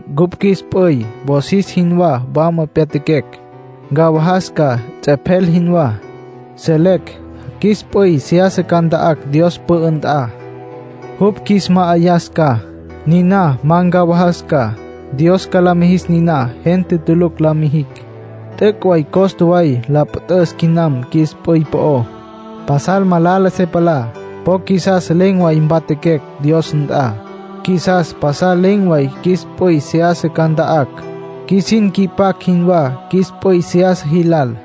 Cupj qjuis p'üy wosis jinwá wama pyatjaquecj. Ncawajas ca, ts'epjel jinwá. Selecj qjuis p'üy seyasa ca nta'acj Dios pü'ü nt'a, jupj qjuis ma'ayas ca. Niná ma ncawajas ca. Dios ca la mijis niná, gente tulucj la mijicj. T'üc' way costa way la püt'üs quinam qjuis p'üy po'ó. Pasal malala se palá. Po qjuisas len̈ way mpatjaquecj Dios nt'a, qjuisas pasal len̈ way qjuis p'üy seyasa ca nta'acj. Qjuisin nqui'pacj jinwá qjuis p'üy seyasa jilal.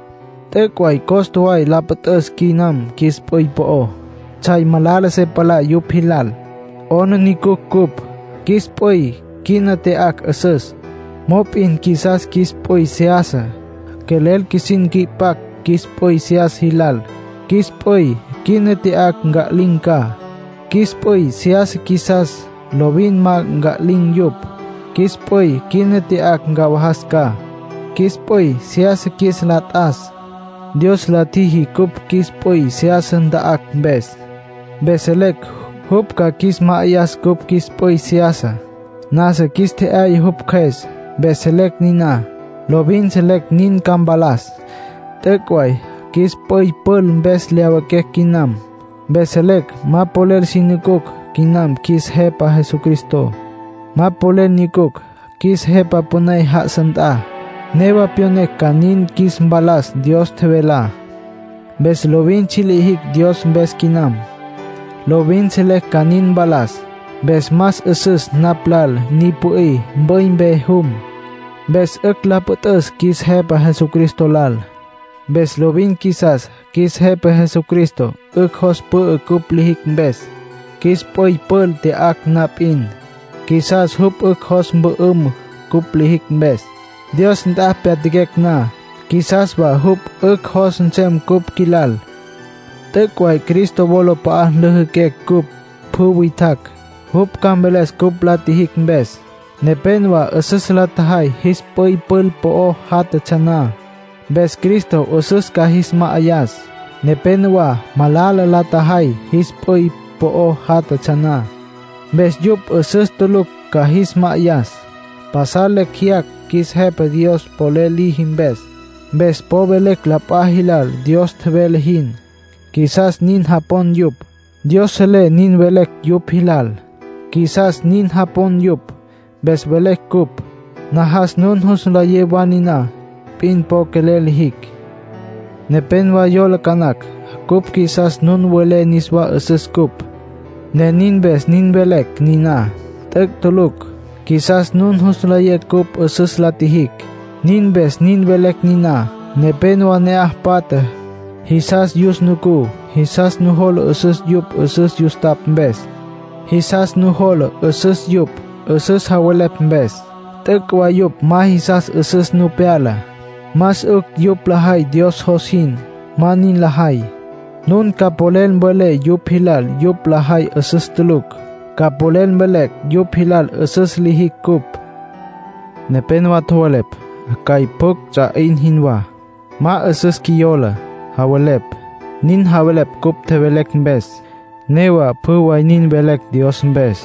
T'üc' way costa way la püt'üs quinam qjuis p'üy po'ó. Tsjay malala se palá yupj jilal. 'Aplijila cupj. Qjuis p'üy quina tya'acj 'üsüs. Mop'in qjuisas qjuis p'üy seyasa, quelel qjuisin nqui'pacj qjuis p'üy seyasa jilal. Qjuis p'üy quina tya'acj nca'lin̈ ca. Qjuis p'üy seyasa qjuisas, lovin ma nca'lin̈ yupj. Qjuis p'üy quina tya'acj ncawajas ca; qjuis p'üy seyasa qjuis la t'as. Dios la tjiji cupj, qjuis p'üy seyasa nta'acj mpes. Mpes selecj jupj ca qjuis ma'ayas cupj qjuis p'üy seyasá. Nasa qjuis tje'yaya jupj Cjües, mpes selecj niná. Lovin selecj nin ca mpalas. T'üc' way qjuis p'üy pül mpes lyawiquecj quinam. Mpes selecj ma polel si nucucj quinam qjuis Jepa Jesucristo. Ma polel nyucucj qjuis Jepa Püné já'asa nt'a. Newa pyonecj ca nin qjuis mpalas Dios tjevelá. Mpes lovin tsji' lijicj Dios mpes quinam. Lovin selecj ca nin mpalas. Mpes más 'üsüs napj lal ni pü'í, mp'üy mpe jum. Mpes 'ücj la püt'üs qjuis Jepa Jesucristo lal. Mpes lovin qjuisas qjuis Jepa Jesucristo 'ücj jos pü'ü cupj lijicj mpes. Qjuis p'üy pül tya'acj na p'in, qjuisas jupj 'ücj jos mpü'üm cupj lijicj mpes. Dios nt'a pyatjaquecj na, qjuisas wa jupj 'ücj jos nsem cupj qjuilal. T'üc' way Cristo wolap'a'a nlüjüquecj cupj pjü witjacj. Jupj ca mveles cupj la tjijicj mpes. Nepénowa 'üsüs la tjajay jis p'üy pül po'o játjatsja na. Mpes Cristo 'üsüs ca jis ma'ayas. Nepénowa malala la tjajay jis p'üy po'o játjatsja na. Mpes jupj 'üsüs tulucj ca jis ma'ayas. Pasal lecj jeyacj qjuis Jepa Dios polel liji mpes. Mpes po velecj la p'a jilal Dios tjevele jin; qjuisas nin japon yupj. Dios selé nin velecj yupj jilal; qjuisas nin japon yupj, mpes velecj cupj. Najas nun jus nlayé wa niná p'in po quelel lijicj. Nepénowa yola ca nacj cupj qjuisas nun welé niswá 'üsüs cupj, ne nin mpes nin velecj niná. T'üc' tulucj. Qjuisas nun jus nlayé cupj 'üsüs la tjijicj, nin mpes nin velecj niná. Nepénowa ne'aj patja, jisas yus nucú. Jisas nujola 'üsüs yupj 'üsüs yustapj mpes. Jisas nujola 'üsüs yupj, 'üsüs javelepj mpes. T'üc' way yupj ma jisas 'üsüs nu pyala. Más 'ücj yupj lajay Dios jos jin; ma nin lajay. Nun ca polel mvelé yupj jilal yupj lajay 'üsüs tulucj. Ca polel mvelé yupj jilal 'üsüs lijicj cupj. Nepénowa tjowelepj cjay pjucj ts'a 'in jinwá, ma 'üsüs qjuiyola, javelepj. Nin javelepj cupj tjevelecj mpes. Newa pjü way nin velecj Dios mpes.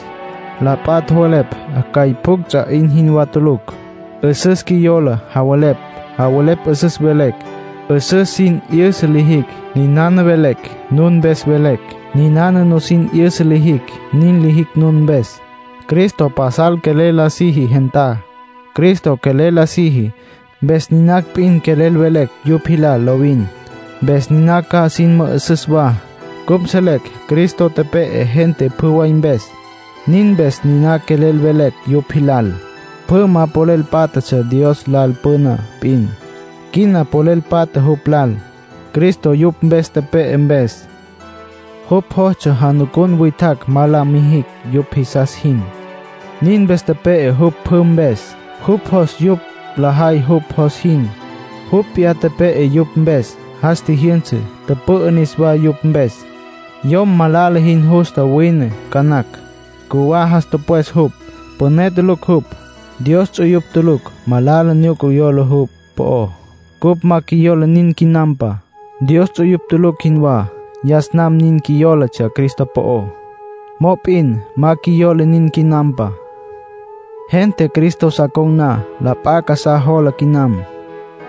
La p'a tjowelepj cjay pjucj ts'a 'in jinwá tulucj, 'üsüs qjuiyola, javelepj. Javelepj 'üsüs velecj, 'üsüs sin 'yüsa lijicj. Ninana velecj, nun mpes velecj. Ninana nusin 'yüsa lijicj, nin lijicj nun mpes. Cristo pasal quelel la siji gentá. Cristo quelel la siji, mpes niná p'in quelel velecj yupj jilal lovin. Mpes niná ca sin mü'üsüs wa. Cupj selecj Cristo tepe'e gente pjü way mpes; nin mpes niná quelel velecj yupj jilal. Pjü ma polel pátjatsja Dios lal püna p'in. Quina polel patja jupj lal, Cristo yupj mpes tepe'e mpes. Jupj jostsja janucun witjacj ma la mijicj yupj jisas jin; nin mpes tepe'e jupj pjü mpes. Jupj jos yupj lajay jupj jos jin; jupj p'iyá tepe'e yupj mpes, jas tjijyünsa, tüpü'ü niswá yupj mpes. Yom malala jin justa wine ca nacj; cjuwá jas tüpwes jupj, püné tulucj jupj. Dios ts'uyupj tulucj malala nyuca yola jupj po'ó. Cupj ma qjuiyola nin quinampa, Dios ts'uyupj tulucj jinwá. Yas nam nin qjuiyólatsja Cristo po'ó. Mop'in ma qjuiyola nin quinampa. Gente Cristo sa con̈ na, la p'a casá jola quinam.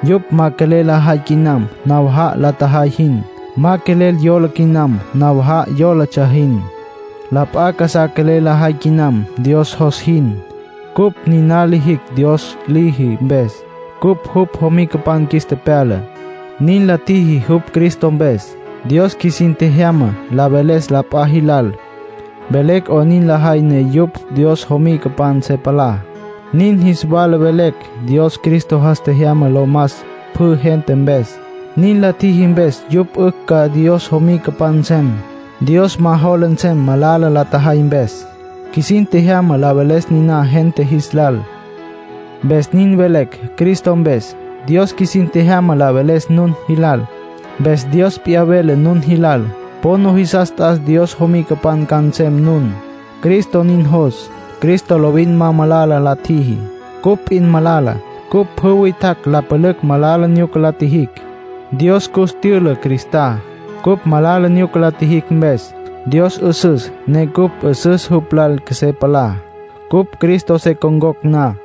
Yupj ma quelel lajay quinam nawaja'a la tjajay jin. Ma quelel yola quinam nawaja'a yólatsja jin. La p'a casá quelel lajay quinam, Dios jos jin. Cupj niná lijicj Dios liji mpes. Cupj jupj jomicapan qjuis tepyala, nin la tjiji jupj Cristo mpes. Dios qjuisin tjejyama la veles la p'a jilal, velecj 'onin lajay ne yupj Dios jomicapan se palá. Nin jis wala velecj Dios Cristo jas tjejyama lo mas pjü gente mpes. Nin la tjiji mpes yupj 'ücj ca Dios jomicapan nsem. Dios ma jola nsem malala la tjajay mpes. Qjuisin tjejyama la veles niná gente jis lal. Mpes nin velecj Cristo mpes. Dios qjuisin tjejyama la veles nun jilal. Mpes Dios p'iyá vele nun jilal. Po nujisas t'as Dios jomicapan ca nsem nun. Cristo nin jos. Cristo lovin ma malala la tjiji. Cupj p'in malala; cupj pjü witjacj la pülücj malala nyuca la tjijicj. Dios cus tyüla Cristá, cupj malala nyuca la tjijicj mpes. Dios 'üsüs, ne cupj 'üsüs jupj lal qjuesé palá, cupj Cristo se con̈cocj na.